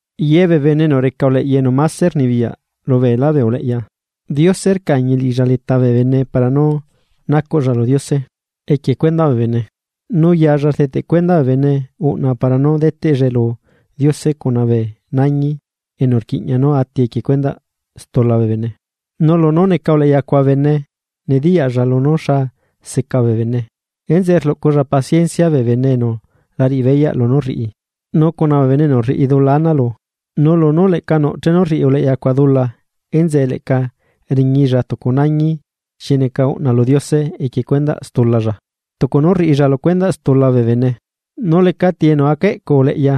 Yebee bene enu reca uleꞌya enu máse rnibiyaꞌ lu beelá bee uleꞌya, Diose rcañi liꞌilla leta bee bene para nú nacuꞌlla lu Diose equie cuendaꞌ bee bene, nu yalla rdeteꞌ cuenda bee bene uꞌna para nú deteꞌllae lu Diose cuna bee nañi enu rquiꞌña nú ati equie cuendaꞌ stula bee bene. Nu lunú neca uleꞌya cuaꞌ bene nediyaꞌlla lunú xa seca bee bene. Enzeꞌe rluꞌculla paciencia bee bene enu la riꞌibeyaꞌ lunú rriꞌi, nu cuna bee bene enu rriꞌi dula ana lu. Nu lunú leꞌca nuꞌ chenu rriꞌi uleꞌyacuaꞌ dula enzeꞌe leꞌca riñilla tucu nañi xi neca uꞌna lu Diose equie cuendaꞌ stulalla, tucu nú rriꞌilla lu cuendaꞌ stula bee bene. Nu lecati enu aca eꞌcu uleꞌya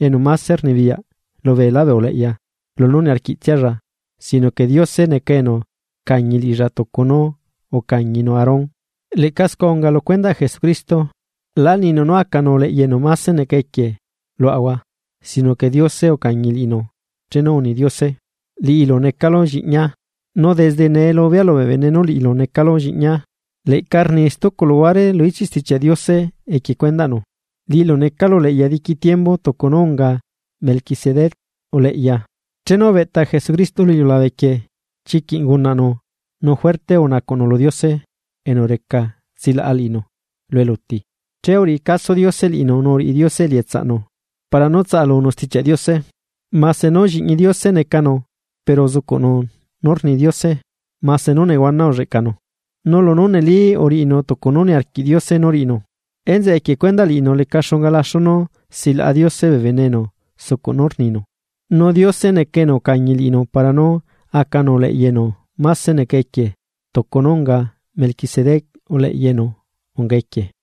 enu máse rnibiyaꞌ lubeelá bee uleꞌya lunú niarquiꞌtsialla sino que Diose neca enu rcañi liꞌilla tucu nú ucañinu Aarón. Leꞌca scua unga lu cuendaꞌ Jesucristo, lá ninu nú a acanu uleꞌya enu máse neca equie luaꞌahua, sino que Diose ucañi liꞌinu chenu uni Diose: Liꞌilu necalu lliꞌñia, nu desde nee lubea lubee bene nú liꞌilu necalu lliꞌñia. Leꞌca rni stucu luguare lu ichiꞌ Stichiaꞌ Diose equie cuendaꞌnu: Liꞌilu necalu uleꞌya diqui tiembu, tucu nú unga Melquisedec uleꞌya. Chenu ubeꞌta Jesucristo lu iliulabe quieꞌ, chiquiꞌ ungunaꞌnu nu juerte unacuꞌnu lu Diose enu reca tsilaꞌa liꞌinu lu eluti. Che uriꞌi caso Diose liꞌinu nu uriꞌi Diose elietsaꞌnu para nú tsalunu Stichiaꞌ Diose. Mase nú lliꞌñi Diose necanu pero uzucuꞌnu nú rni Diose mase nú nehuana ulleꞌcanu. Nu lunú neli uriꞌinu tucu nú niarquiꞌ Diose nú riꞌinu, enzeꞌe equie cuendaꞌ liꞌinu leca xunga laxu nú silaꞌa Diose bee bene enu sucuꞌ nú rninu. Nu Diose neca enu ucañi liꞌinu para nú acanu uleꞌya enu máse neca equie tucu nú unga Melquisedec uleꞌya enu unga neca equie.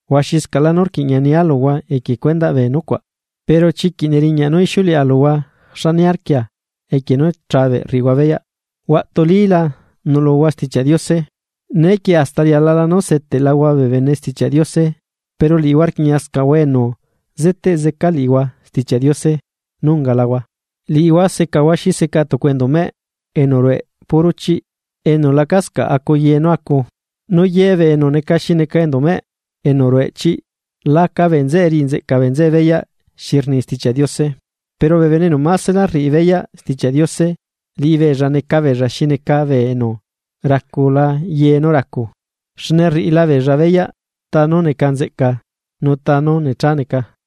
Huaxiscaꞌlá nú rquiꞌña nia luhua equie cuendaꞌ bee nucuaꞌ, pero chiquiꞌ neriñaꞌ nú ixiuleꞌa luhua xa niarquia equie nú chabeꞌ rriꞌihua beyaꞌ. Huaꞌtulila nuꞌluhua Stichiaꞌ Diose, neequie hasta rialala nú seteꞌlahua bee bene Stichiaꞌ Diose pero liꞌihua rquiꞌñiascaꞌhua enu zeteꞌ zeca liꞌihua Stichiaꞌ Diose nú ungalahua. Liꞌihua secahua xi seca tucu enduꞌ meꞌ enu rueꞌ puro chiꞌ enu lacascaꞌ acu ye nú acu. Nu yebee enu neca xi neca enduꞌmeꞌ enu rueꞌ chiꞌ la aca bee nzeꞌe riꞌi nzeꞌca bee nzeꞌe beyaꞌ xi rni Stichiaꞌ Diose. Pero bee bene enu másela rriꞌi beyaꞌ Stichiaꞌ Diose, liꞌibeella neca beella xi neca bee enu racula ye nú racu. Xne rriꞌilabeella beyaꞌ tá nú neca nzeꞌca nu ta nú necha neca.